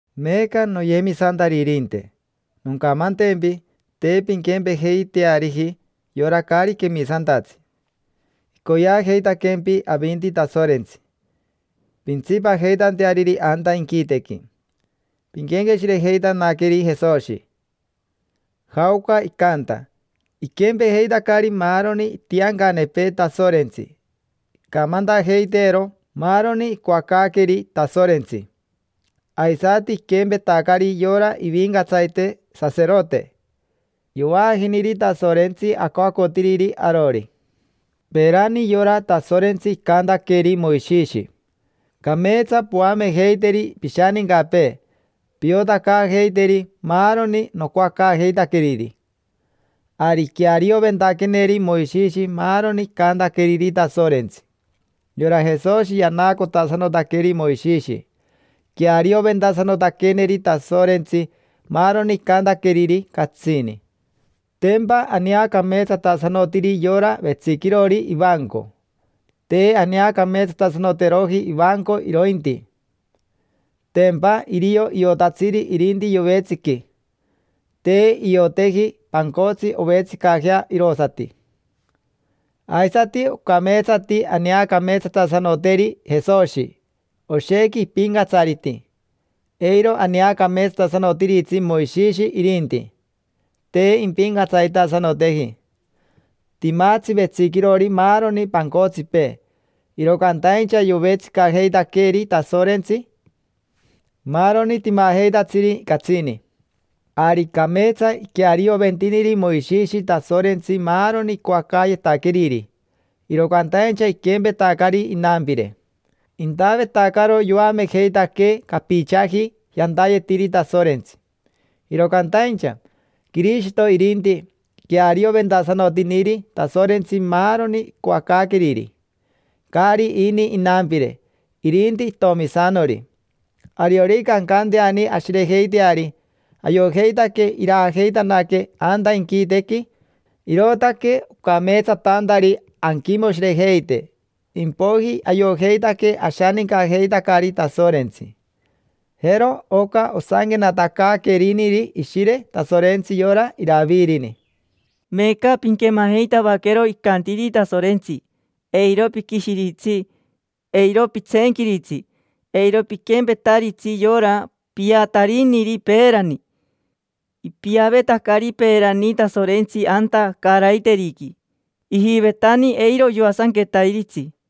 Meeca, noyemisantaririnte, noncamantempi te pinquempejeiteariji yora caari quemisantatsi: icoyeajeitaquempi avinti Tasorentsi pintsipajeitanteariri anta inquitequi. Pinquenqueshirejeitanaqueri Jesoshi, jaoca icanta: iquempejeitacari maaroni itiancanepee Tasorentsi, icamantajeiteero maaroni icoacaaqueeri Tasorentsi. Aisati iquempetacari yora ivincatsarite saserote: yovaajiniri Tasorentsi acoacotiriri arori. Peerani yora Tasorentsi icantaqueri Moishishi: “Cameetsa poamejeiteri pishanincapee, piotacaajeiteri maaroni nocoacaajeitaqueriri”. Ari iquearioventaqueneri Moishishi maaroni icantaqueriri Tasorentsi. Yora Jesoshi yanaacotasanotaqueri Moishishi, iquearioventasanotaqueneri Tasorentsi maaroni icantaqueriri, catsini. Tempa aneacameetsatasanotiri yora vetsiquirori ivanco: te aneacameetsatasanoteroji ivanco irointi. Tempa irio iotatsiri irinti yovetsiqui: te ioteji pancotsi ovetsicajea irosati. Aisati ocameetsati aneacameetsatasanoteri Jesoshi, oshequi ipincatsariti; eiro aneacameetsatasanotiritsi Moishishi irinti, te impincatsaritasanoteji. Timatsi vetsiquirori maaroni pancotsipee, iro cantaincha yovetsicajeitaqueri Tasorentsi maaroni timajeitatsiri, catsini. Ari cameetsa iquearioventiniri Moishishi Tasorentsi maaroni icoacaayetaqueriri, iro cantaincha iquempetacari inampire. Intavetacaro yoamejeitaquee capichaji yantayetiri Tasorentsi. Iro cantaincha, Quirishito irinti, iquearioventasanotiniri Tasorentsi maaroni icoacaaqueriri. Caari ini inampire, irinti itomisanori. Ariorica ancanteani ashirejeiteari, ayojeitaque iraajeitanaquee anta inquitequi, irootaque ocameetsatantari anquimoshirejeite, impoiji ayojeitaque ashanincajeitacari Tasorentsi. Jero oca osanquenatacaaqueriniri Ishire Tasorentsi yora Iravirini: “Meeca pinquemajeitavaquero icantiri Tasorentsi. Eiro piquishiritsi, eiro pitseenquiritsi: eiro piquempetaritsi yora piatariniri peerani. Ipiavetacari peerani Tasorentsi anta caaraiteriqui, ijivetani eiro yoasanquetairitsi.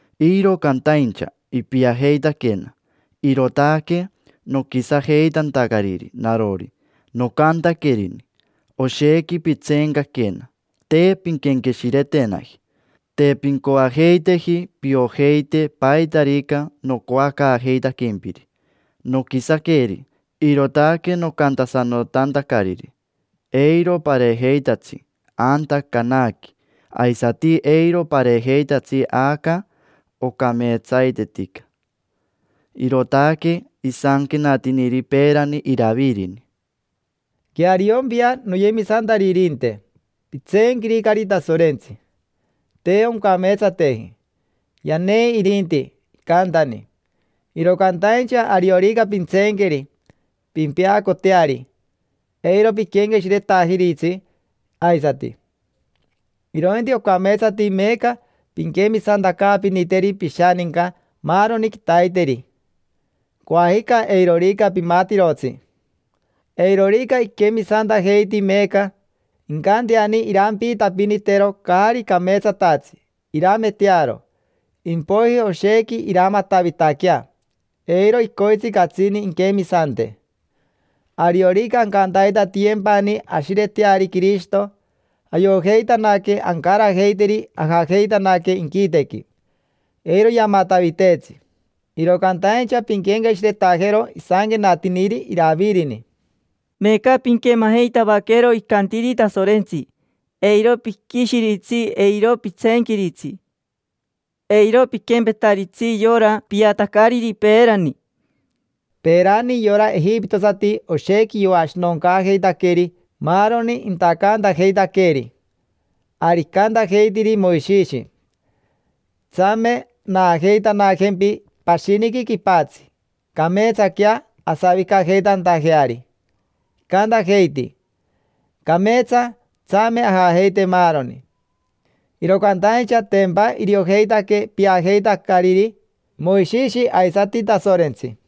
Iro cantaincha ipiajeitaquena, irootaque noquisajeitantacariri narori, nocantaquerini: Oshequi pitseencaquena, te pinquenqueshiretenaji. Te pincoajeiteji piojeite paitarica nocoacaajeitaquempiri. Noquisaqueri, irootaque nocantasanotantacariri: Eiro pareejeitatsi anta Canaqui, aisati eiro pareejeitatsi aca ocameetsaitetica’”. Irootaque isanquenatiniri peerani Iravirini. Queariompia, noyemisantaririnte, pitseenquiricari Tasorentsi: te oncameetsateji. Yanei irinti, icantani. Iro cantaincha ariorica pintseenqueri, pimpeacoteari: eiro piquenqueshiretajiritsi aisati. Irointi ocameetsati meeca pinquemisantacaapiniteri pishaninca maaroni quitaiteri: coajica eirorica pimatirotsi. Eirorica iquemisantajeiti meeca, incanteani irampiitapinitero caari cameetsatatsi, irametearo: impoiji oshequi iramatavitaquea, eiro icoitsi catsini inquemisante. Ariorica ancantaitatiyempani ashireteari Quirishito, ayojeitanaque ancarajeiteri ajajeitanaque inquitequi: eiro yamataviteetsi. Iro cantaincha pinquenqueshiretajero isanquenatiniri Iravirini: “Meeca pinquemajeitavaquero icantiri Tasorentsi. Eiro piquishiritsi, eiro pitseenquiritsi: eiro piquempetaritsi yora piatacariri peerani”. Peerani yora ejipitosati oshequi yoashinoncaajeitaqueri maaroni intacantajeitaqueeri. Ari icantajeitiri Moishishi: “Tsame, naajeitanajempi pashiniqui quipatsi, cameetsaquea asavicajeitantajeari”. Icantajeiti: “Cameetsa, tsame ajajeite maaroni”. Iro cantaincha tempa iriojeitaque piajeitacariri Moishishi aisati Tasorentsi.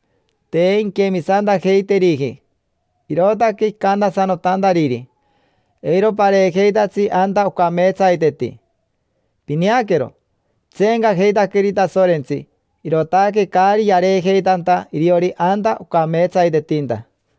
Te inquemisantajeiteriji, irootaque icantasanotantariri: “Eiro pareejeitatsi anta ocameetsaiteti”. Pineaquero, itseencajeitaqueri Tasorentsi, irootaque caari yareejeitanta iriori anta ocameetsaitetinta.